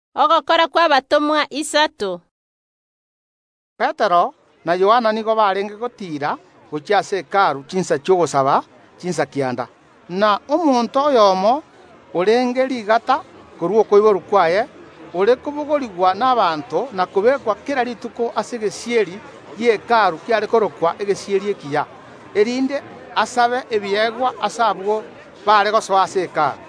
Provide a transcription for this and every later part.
Rituko erimo Petero na Yohana nigo barenge gotiira gochia ase Hekalu chinsa chi’ogosaba, chinsa kianda. Na omonto oyomo, orenge rigata korwa okoiborwa kwaye, ore kobogorigwa n’abanto na kobeekwa kera rituko ase egesieri gie Hekalu kiare korokwa Egesieri Ekiya, erinde asabe ebiegwa ase abwo baare gosoa ase Hekalu.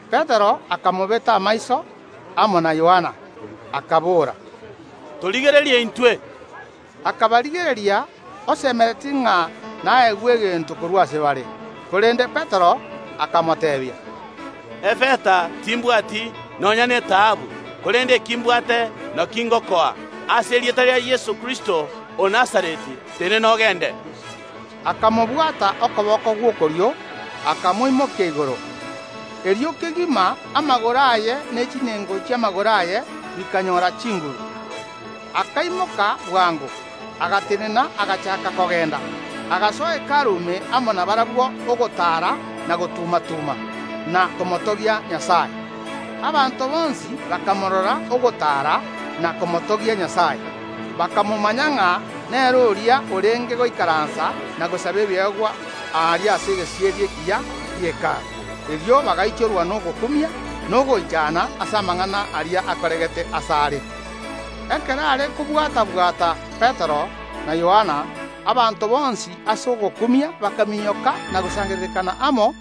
Petero akamobeta amaiso, amo na Yohana, akabora: “Torigererie intwe!” Akabarigereria, osemeretie ng’a naegwe egento korwa ase bare. Korende Petero akamoteebia: “Efeta timbwati, nonya netaabu, korende eki mbwate nakio ngokoa: Ase erieta ria Yeso Kristo o Nazareti, tenena ogende!” Akamobwata okoboko gw’okorio, akamoimokia igoro. Erio kegima amagoro aye ne chinengo chi’amagoro aye bikanyora chinguru. Akaimoka bwango, agatenena, agachaaka kogenda, agasoa Hekalu ime amo nabarabwo, ogotaara na gotuma‐tuma, na komotogia Nyasae. Abanto bonsi bakamorora ogotaara na komotogia Nyasae. Bakamomanya ng’a nere oria orenge goikaransa na gosaba ebiegwa aria ase Egesieri Ekiya gie Hekalu. Erio bagaichorwa nogokumia na ogoichana ase amang’ana aria akoregete asare. Ekero are kobwata‐bwata Petero na Yohana, abanto bonsi ase ogokumia bakaminyoka na gosangererekana amo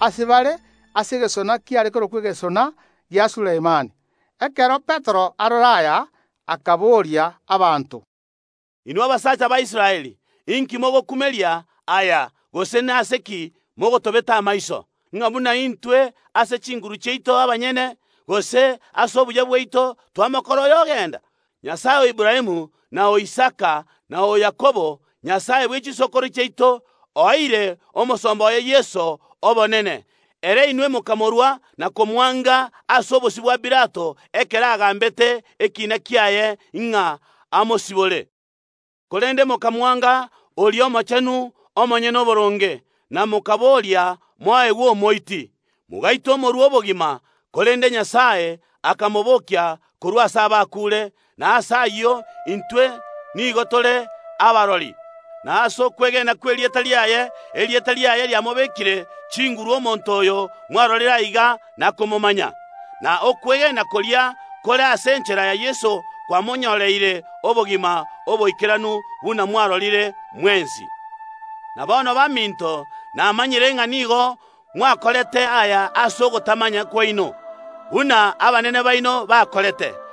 ase bare ase egesona kiare korokwa Egesona gia Sulemani. Ekero Petero arora aya akaboria abanto: “Inwe abasacha ba Israeli, inki mogokumeria aya gose nase ki inwe mogotobeta amaiso, ng’a buna intwe ase chinguru chiaito abanyene, gose ase obuya bwaito, twamokora oyo ogenda? Nyasae o Aburaamu, na o Isaka, na o Yakobo, Nyasae bwe chisokoro chiaito, oeire Omosomba oye Yeso obonene, ere inwe mokamorua na komwanga ase obosio bwa Pilato, ekero agambete ekiina kiaye ng’a amosibore. Korende mokamwanga oria Omochenu, Omonyene Oboronge, na mokaboria moegwe omoiti. Mogaita Omotongi bw’obogima. Korende Nyasae akamobokia korwa ase abakuure, na ase ayio intwe nigo tore kirori. Na ase okwegena kw’erieta riaye, erieta riaye riamobekire chinguru omonto oyo mwarorire aiga na komomanya; na okwegena koria kore ase enchera ya Yeso kwamonyoreire obogima oboikeranu, buna mwarorire mwensi. “Na bono baminto, namanyire ng’a nigo mwakorete aya ase ogotamanya kwaino, buna abanene baino bakorete.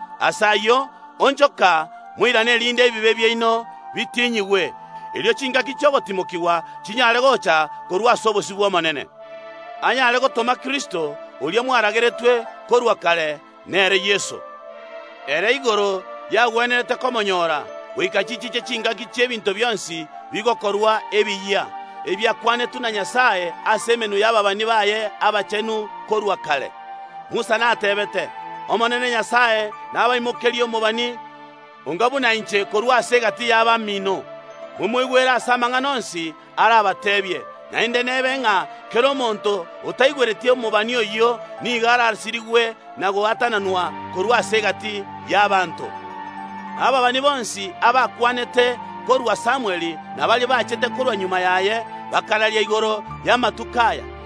Ase ayio onchoka, moirane, erinde ebibe biaino bitinyigwe, erio chingaki chi’ogotimokigwa chinyare gocha korwa ase obosio bw’Omonene, anyare gotoma Yeso, oria mwarageretwe korwa kare, nere Kristo. Ere igoro yagwenerete komonyoora, goika chichiche chingaki chi’ebinto bionsi bigokorwa ebiyia, ebiakwanetwe na Nyasae ase emenwa y’ababani baaye abachenu korwa kare. Musa nateebete: Omonene Nyasae oino nabatomere omobani buna antomete korwa ase egati y’abamino. Momoigwere ase amang’ana onsi arabateebie. Naende nebe ng’a kera omonto otaigwereti omobani oyio nigo arasirigwe na gwatananwa korwa ase egati y’abanto ba Nyasae. Na ababani bonsi abakwanete korwa Samweli, na baria bachete korwa magega yaye, bakararia igoro yaria agokoreka ase amatuko aya.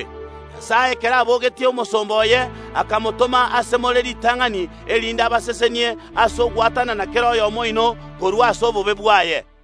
Ekero Nyasae abogetie Omosomba oye, akamotoma ase more ritang’ani, erinde abasesenie ase ogwatanana kera oyomo oino korwa ase obobe bwaye.”